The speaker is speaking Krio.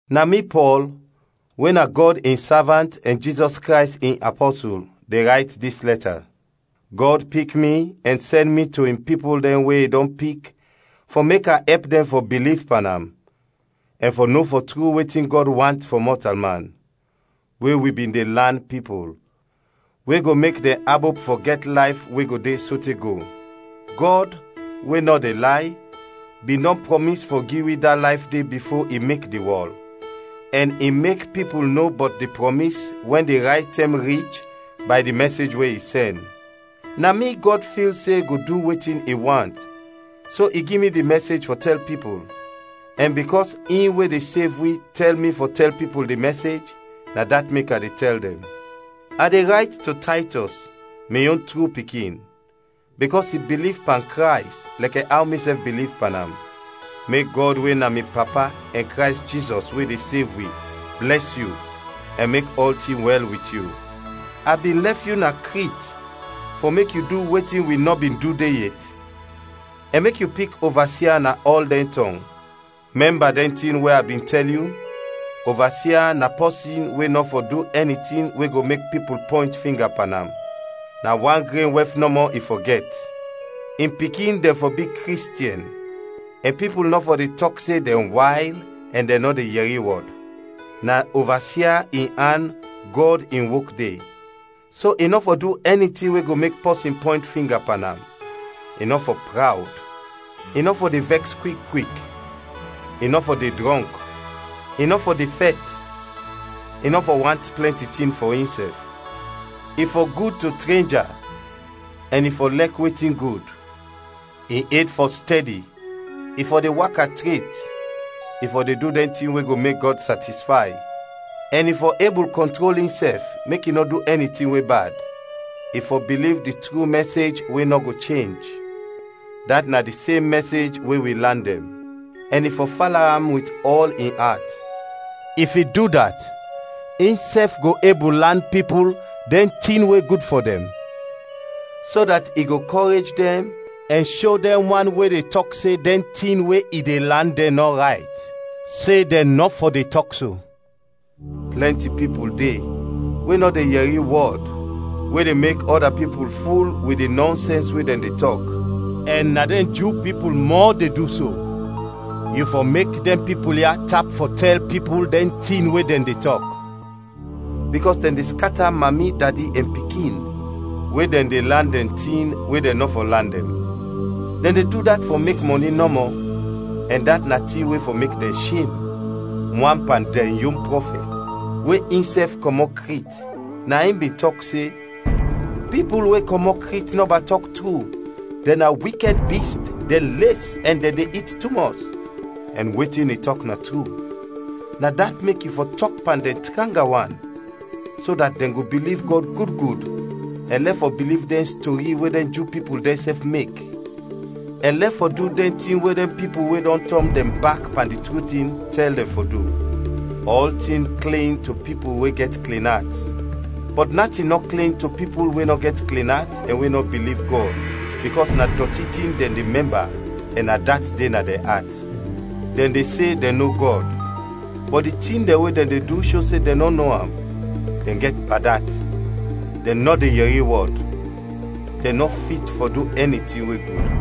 Na mi, Pɔl, we na Gɔd in savant ɛn Jizɔs Krays in apɔsul, de rayt dis lɛta. Gɔd pik mi ɛn sɛn mi to in pipul dɛn we i dɔn pik fɔ mek a ɛp dɛn fɔ biliv pan am, ɛn fɔ no fɔ tru wetin Gɔd want fɔ mɔtalman, we wi bin de lan pipul, we go mek dɛn abop fɔ gɛt layf we go de sote go. Gɔd, we nɔ de lay, bin dɔn prɔmis fɔ gi wi da layf de bifo i mek di wɔl, ɛn i mek pipul no bɔt di prɔmis wɛn di rayt tɛm rich bay di mɛsej we i sɛn. Na mi Gɔd fil se go du wetin i want so i gi mi di mɛsej fɔ tɛl pipul; ɛn bikɔs in we de sev wi tɛl mi fɔ tɛl pipul di mɛsej, na dat mek a de tɛl dɛn. A de rayt to Taytɔs, mi yon tru pikin, bikɔs i biliv pan Krays lɛkɛ aw misɛf biliv pan am. Mek Gɔd we na mi Papa ɛn Krays Jizɔs we de sev wi blɛs yu ɛn mek ɔltin wɛl wit yu. A bin lɛf yu na Krit fɔ mek yu du wetin wi nɔ bin du de yet, ɛn mek yu pik ovasia na ɔl dɛn tɔng. Mɛmba dɛn tin we a bin tɛl yu: Ovasia na pɔsin we nɔ fɔ du ɛni tin we go mek pipul pɔynt finga pan am; na wan gren wɛf nɔmɔ i fɔ gɛt; in pikin dɛn fɔ bi Kristiɛn, ɛn pipul nɔ fɔ de tɔk se dɛn wayl ɛn dɛn nɔ de yɛri wɔd. Na ovasia in an Gɔd in wok de, so i nɔ fɔ du ɛni tin we go mek pɔsin pɔynt finga pan am. I nɔ fɔ prawd, i nɔ fɔ de vɛks kwik kwik, i nɔ fɔ de drɔnk, i nɔ fɔ de fɛt, i nɔ fɔ want plɛnti tin fɔ insɛf. I fɔ gud to trenja, ɛn i fɔ lɛk wetin gud. In ed fɔ stɛdi, i fɔ de waka tret, i fɔ de du dɛn tin we go mek Gɔd satisfay, ɛn i fɔ ebul kɔntrol insɛf mek i nɔ du ɛni tin we bad. I fɔ biliv di tru mɛsej we nɔ go chenj, dat na di sem mɛsej we wi lan dɛn; ɛn i fɔ fala am wit ɔl in at. If i du dat, insɛf go ebul lan pipul dɛn tin we gud fɔ dɛn, so dat i go kɔrej dɛn ɛn sho dɛn wan we de tɔk se dɛn tin we i de lan dɛn nɔ rayt, se dɛn nɔ fɔ de tɔk so. Plɛnti pipul de, we nɔ de yɛri wɔd, we de mek ɔda pipul ful wit di nɔnsɛns we dɛn de tɔk, ɛn na dɛn Ju pipul mɔ de du so. Yu fɔ mek dɛn pipul ya tap fɔ tɛl pipul dɛn tin we dɛn de tɔk, bikɔs dɛn de skata mami, dadi, ɛn pikin, we dɛn de lan dɛn tin we dɛn nɔ fɔ lan dɛn. Dɛn de du dat fɔ mek mɔni nɔmɔ, ɛn dat na tin we fɔ mek dɛn shem. Wan pan dɛn yon prɔfɛt, we insɛf kɔmɔt Krit, na in bin tɔk se, “Pipul we kɔmɔt Krit nɔba tɔk tru, dɛn na wikɛd bist, dɛn les ɛn dɛn de it tumɔs.” Ɛn wetin i tɔk na tru, na dat mek yu fɔ tɔk pan dɛn tranga wan, so dat dɛn go biliv Gɔd gud gud, ɛn lɛf fɔ biliv dɛn stori we na dɛn Ju pipul dɛnsɛf mek, ɛn lɛf fɔ du dɛn tin we dɛn pipul we dɔn tɔn dɛn bak pan di tru tin, tɛl dɛn fɔ du. Ɔltin klin to pipul we gɛt klin at; bɔt natin nɔ klin to pipul we nɔ gɛt klin at ɛn we nɔ biliv Gɔd, bikɔs na dɔti tin dɛn de mɛmba ɛn na dat de na dɛn at. Dɛn de se dɛn no Gɔd, bɔt di tin dɛn we dɛn de du sho se dɛn nɔ no am. Dɛn gɛt bad at, dɛn nɔ de yɛri wɔd, dɛn nɔ fit fɔ du ɛni tin we gud.